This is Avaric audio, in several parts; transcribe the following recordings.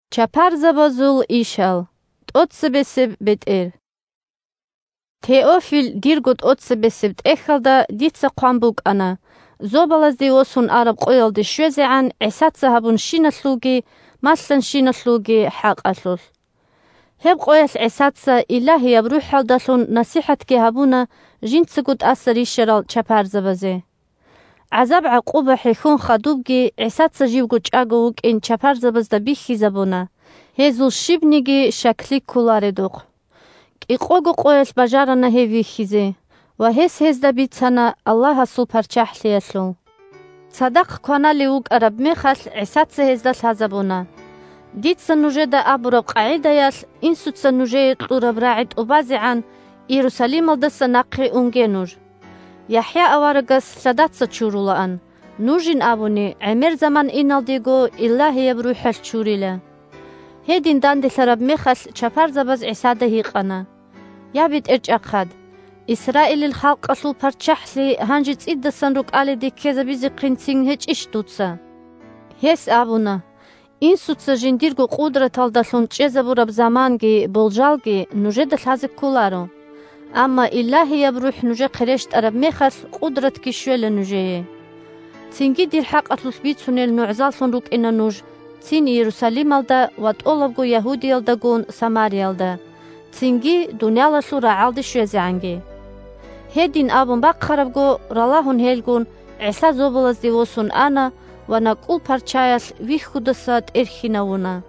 бетӀер ЦеберагӀи 1Теофил, дирго тӀоцебесеб тӀехьалда дица хъван букӀана, зобалазде восун араб къоялде щвезегӀан ГӀисаца гьабунщиналъулги малъанщиналъулги хӀакъалъулъ. Гьеб къоялъ ГӀисаца Илагьияб РухӀалдалъун насихӀатги гьабуна жинцаго тӀаса рищарал чапарзабазе. ГӀазаб-гӀакъуба хӀехьон хадубги ГӀисаца живго чӀаго вукӀин чапарзабазда бихьизабуна, гьезул щибниги щаклъи кколаредухъ. КӀикъого къоялъ бажарана гьев вихьизе, ва гьес гьезда бицана Аллагьасул ПарччахӀлъиялъул. Цадахъ кваналев вукӀараб мехалъ ГӀисаца гьезда лъазабуна: – Дица нужеда абураб къагӀидаялъ, Инсуца нужее кьураб рагӀи тӀубазегӀан, Иерусалималдаса нахъе унге нуж. ЯхӀя аварагас лъадаца чурулаан, нужин абуни, гӀемер заман иналдего Илагьияб РухӀалъ чурила. Гьедин данделъараб мехалъ чапарзабаз ГӀисада гьикъана: – Я, БетӀерчӀахъад, Исраилил халкъалъул парччахӀлъи гьанже цӀидасан рукӀалиде ккезабизехъинцин гьечӀищ дуца? Гьес абуна: – Инсуца жиндирго къудраталдалъун чӀезабураб заманги болжалги нужеда лъазе кколаро. Амма Илагьияб РухӀ нужехъе рещтӀараб мехалъ, къудратги щвела нужее. Цинги дир хӀакъалъулъ бицунел нугӀзаллъун рукӀина нуж цин Иерусалималда ва тӀолабго Ягьудиялдагун Самариялда, цинги дуниялалъул рагӀалде щвезегӀанги. Гьедин абун бахъарабго, ралагьун гьелгун, ГӀиса зобалазде восун ана ва накӀкӀул парчаялъ вихьудаса тӀерхьинавуна.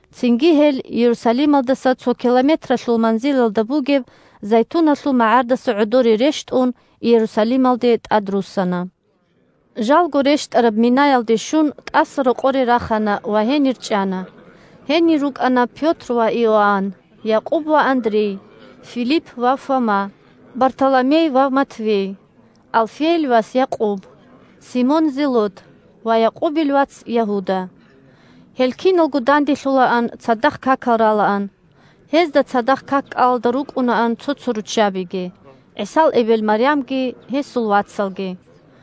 Цинги гьел, Иерусалималдаса цо километралъул манзилалда бугеб Зайтуналъул магӀардаса гӀодоре рещтӀун, Иерусалималде тӀадруссана. Жалго рещтӀараб минаялде щун, тӀасарокъоре рахана ва гьенир чӀана. Гьенир рукӀана Пётр ва Иоанн, Якъуб ва Андрей, Филипп ва Фома, Бартоломей ва Матфей, Алфейил вас Якъуб, Симон Зелот ва Якъубил вац Ягьуда. Гьел киналго данделъулаан, цадахъ какал ралаан. Гьезда цадахъ как-кӀалалда рукӀунаан цо-цо руччабиги, ГӀисал эбел Марямги, гьесул вацалги.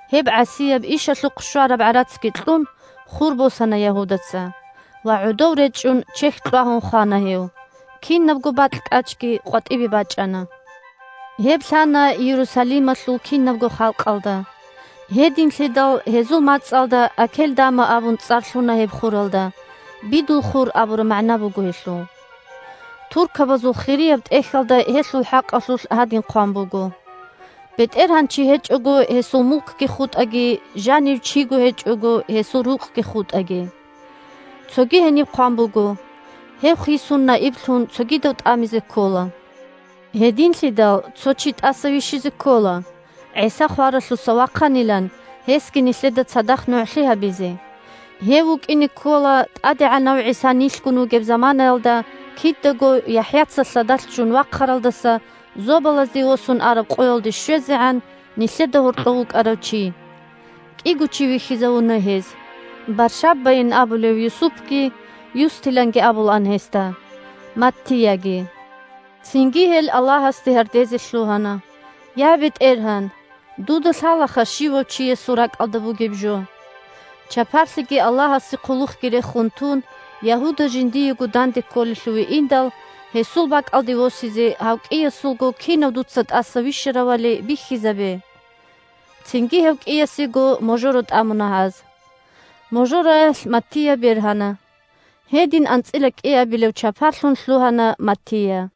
Гьеб гӀасияб ишалъухъ щвараб гӀарацги кьун, хур босана Ягьудаца. Ва гӀодов речӀчӀун, чехь кьвагьун хвана гьев, кинабго бакь-кӀачги къватӀибе бачӀана. Гьеб лъана Иерусалималъул кинабго халкъалда. Гьединлъидал гьезул мацӀалда Акелдама абун цӀар лъуна гьеб хуралда. «Бидул хур» абураб магӀна буго гьелъул.) Туркабазул Хирияб ТӀехьалда гьелъул хӀакъалъулъ гьадин хъван буго: «БетӀергьанчи гьечӀого гьесул мулкги хутӀаги, Жанив чиго гьечӀого гьесул рукъги хутӀаги». Цоги гьениб хъван буго: «Гьев хисун наиблъун цогидав тӀамизе ккола». Гьединлъидал цо чи тӀаса вищизе ккола, ГӀиса хваралъуса вахъанилан гьесги нилъеда цадахъ нугӀлъи гьабизе. Гьев вукӀине ккола ТӀадегӀанав ГӀиса нилъгун вугеб заманаялда кидаго – ЯхӀяца лъадалъ ччун вахъаралдаса зобалазде восун араб къоялде щвезегӀан, – нилъеда гьоркьов вукӀарав чи. КӀиго чи вихьизавуна гьез: Баршаббайин абулев Юсупги (Юстиланги абулаан гьесда) Маттияги. Цинги гьел Аллагьасде гьардезе лъугьана: – Я, БетӀергьан! Дуда лъалаха щивав чиясул ракӀалда бугеб жо. Чапарлъиги Аллагьасе хъулухъги рехун тун, Ягьуда жиндиего данде кколелъуве индал, гьесул бакӀалде восизе гьав кӀиясулго кинав дуца тӀаса вищаравали бихьизабе. Цинги гьев кӀиясего можоро тӀамуна гьаз. Можороялъ Маттия бергьана. Гьедин анцӀила кӀиабилев чапарлъун лъугьана Маттия.